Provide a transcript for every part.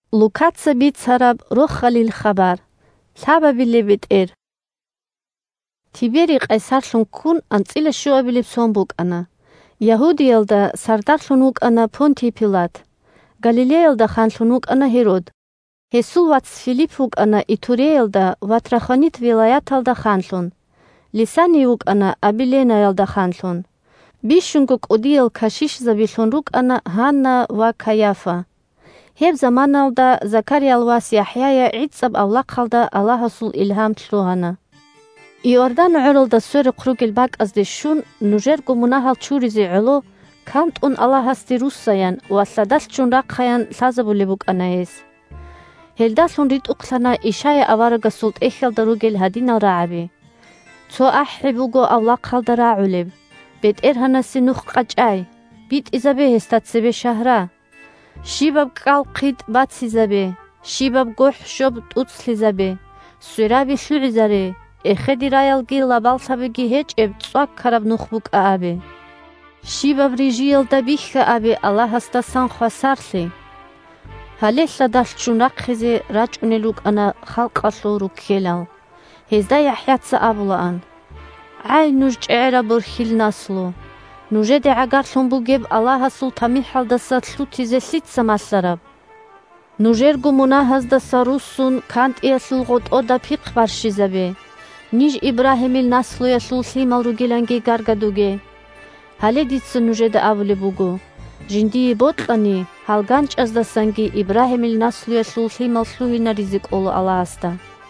бетӀер ЯхӀя авараг халкъалда цеве вахъуна 1Тиберий къайсарлъун ккун анцӀила щуабилеб сон букӀана; Ягьудиялда сардарлъун вукӀана Понтий Пилат; Галилеялда ханлъун вукӀана Гьерод; гьесул вац Филипп вукӀана Итуреялда ва Трахонит вилаяталда ханлъун, Лисаний вукӀана Абиленаялда ханлъун; 2бищунго кӀудиял кашишзабилъун рукӀана Гьанна ва Кайафа. Гьеб заманаялда Закариял вас ЯхӀяе гӀицӀаб авлахъалда Аллагьасул илгьам лъугьана. 3Иордан гӀоралда сверухъ ругел бакӀазде щун, нужерго мунагьал чуризе гӀоло, кантӀун Аллагьасде руссаян ва лъадалъ ччун рахъаян лъазабулеб букӀана гьес. Гьелдалъун ритӀухълъана Ишая аварагасул ТӀехьалда ругел гьадинал рагӀаби: «Цо ахӀи буго авлахъалда рагӀулеб: – БетӀергьанасе нух къачӀай, битӀизабе гьесда цебе шагьра! Щибаб кӀкӀал-хъитӀ бацизабе, щибаб гохӀ-щоб тӀуцлъизабе, свераби лъугӀизаре, эхедераялги лабаллъабиги гьечӀеб, цӀвакараб нух букӀа абе, щибаб рижиялда бихьа абе Аллагьасдасан хвасарлъи!» Гьале лъадалъ ччун рахъизе рачӀунел рукӀана халкъалъул руккелал. Гьезда ЯхӀяца абулаан: – ГӀай, нуж чӀегӀераб борхьил наслу! Нужеде гӀагарлъун бугеб Аллагьасул тамихӀалдаса лъутизе лъица малъараб? Нужерго мунагьаздаса руссун, кантӀиялъул гъотӀода пихъ барщизабе, ниж Ибрагьимил наслуялъул лъимал ругиланги гаргадуге. Гьале дица нужеда абулеб буго: жиндие бокьани, гьал ганчӀаздасанги Ибрагьимил наслуялъул лъимал лъугьинаризе кӀола Аллагьасда.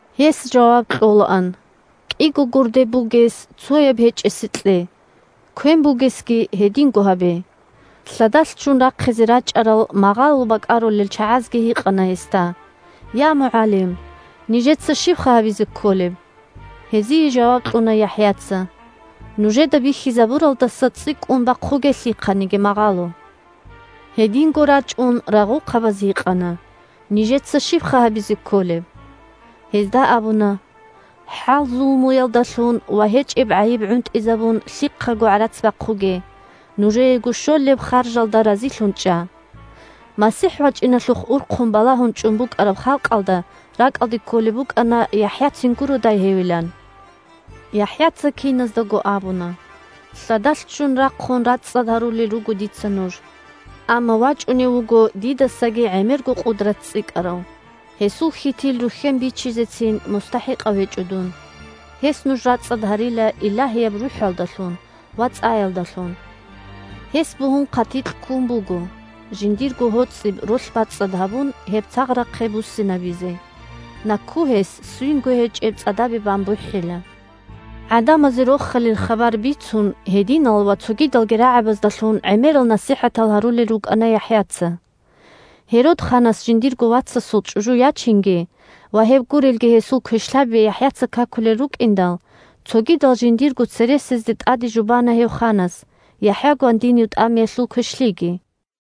Гьес жаваб кьолаан: – КӀиго гурде бугес цояб гьечӀесе кье, квен бугесги гьединго гьабе. Лъадалъ ччун рахъизе рачӀарал магъало бакӀарулел чагӀазги гьикъана гьесда: – Я, МугӀалим, нижеца щибха гьабизе кколеб? Гьезие жаваб кьуна ЯхӀяца: – Нужеда бихьизабуралдаса цӀикӀкӀун бахъуге лъихъаниги магъало. Гьединго рачӀун рагъухъабаз гьикъана: – Нижеца щибха гьабизе кколеб? Гьезда абуна: – ХӀал-зулмуялдалъун ва гьечӀеб гӀайиб гӀунтӀизабун лъихъаго гӀарац бахъуге, нужеего щолеб харжалда разилъун чӀа. МасихӀ вачӀиналъухъ урхъун балагьун чӀун букӀараб халкъалда ракӀалде кколеб букӀана ЯхӀяцин гуродай гьевилан. ЯхӀяца киназдаго абуна: – Лъадалъ ччун рахъун, рацӀцӀад гьарулел руго дица нуж, амма вачӀунев вуго дидасаги гӀемерго къудрат цӀикӀкӀарав. Гьесул хьитил рухьен бичизецин мустахӀикъав гьечӀо дун. Гьес нуж рацӀцӀад гьарила Илагьияб РухӀалдалъун ва цӀаялдалъун. Гьес бугьун хъатикь ккун буго, жиндирго гьоцӀиб ролъ бацӀцӀад гьабун, гьеб цагърахъе буссинабизе, накку гьес ссвинго гьечӀеб цӀадабе бан бухӀила. ГӀадамазе Рохалил хабар бицун, гьединал ва цогидалги рагӀабаздалъун гӀемерал насихӀатал гьарулел рукӀана ЯхӀяца. Гьерод ханас жиндирго вацасул чӀужу ячинги ва гьеб гурелги гьесул квешлъаби ЯхӀяца какулел рукӀиндал, цогидал жиндирго цересезде тӀаде жубана гьев ханас ЯхӀя гвандинив тӀамиялъул квешлъиги.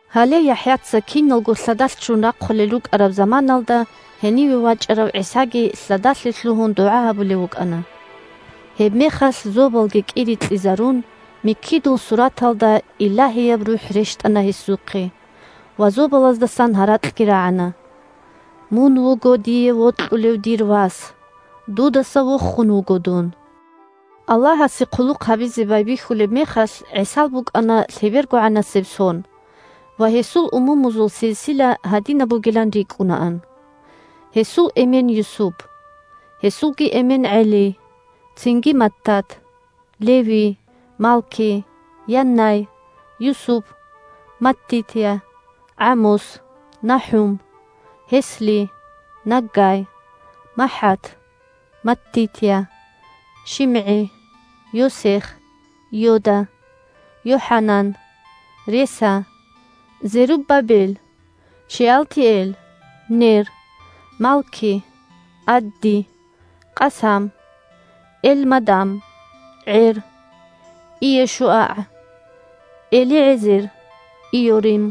Гьале ЯхӀяца киналго лъадалъ ччун рахъулел рукӀараб заманаялда гьениве вачӀарав ГӀисаги лъадалъе лъугьун дугӀа гьабулев вукӀана. Гьебмехалъ зобалги кӀирикьизарун, миккидул сураталда Илагьияб РухӀ рещтӀана гьесухъе ва зобалаздасан гьаракьги рагӀана: – Мун вуго дие вокьулев дир Вас! Дудаса вохун вуго дун! Аллагьасе хъулухъ гьабизе байбихьулеб мехалъ, ГӀисал букӀана лъебергогӀанасеб сон, ва гьесул умумузул силсила гьадинаб бугилан рикӀкӀунаан: гьесул эмен Юсуп, гьесулги эмен ГӀели, цинги Маттат, Леви, Малки, Яннай, Юсуп, Маттитья, ГӀамос, НахӀум, Гьесли, Наггай, МахӀат, Маттитья, ШимгӀи, Йосех, Йода, ЙохӀанан, Реса, Зеруббабел, Шеалтиэл, Нер, Малки, Адди, Къасам, Элмадам, ГӀер, ЙешуагӀ, ЭлигӀезер, Йорим,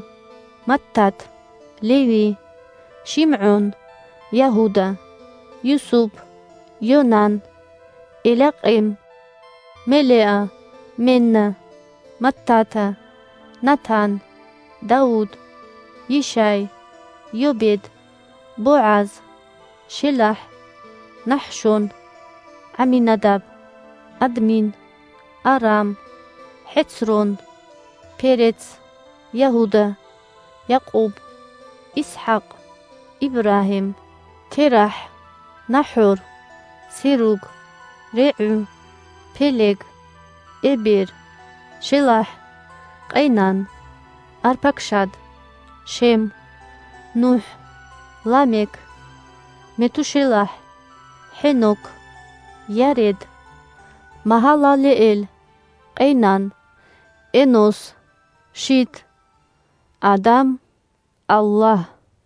Маттат, Леви, ШимгӀон, Ягьуда, Юсуп, Йонан, Элякъим, Мелеа, Менна, Маттата, Натан, Давуд, Йишай, Йобед, БогӀаз, ШелахӀ, НахӀшон, ГӀаминадаб, Админ, Арам, ХӀецрон, Перец, Ягьуда, Якъуб, ИсхӀакъ, Ибрагьим, ТерахӀ, НахӀор, Серуг, РегӀу, Пелег, Эбер, ШелахӀ, Къейнан, Арпакшад, Шем, НухӀ, Ламек, МетушелахӀ, ХӀенок, Йаред, Магьалалеэл, Къейнан, Энос, Шит, Адам, Аллагь.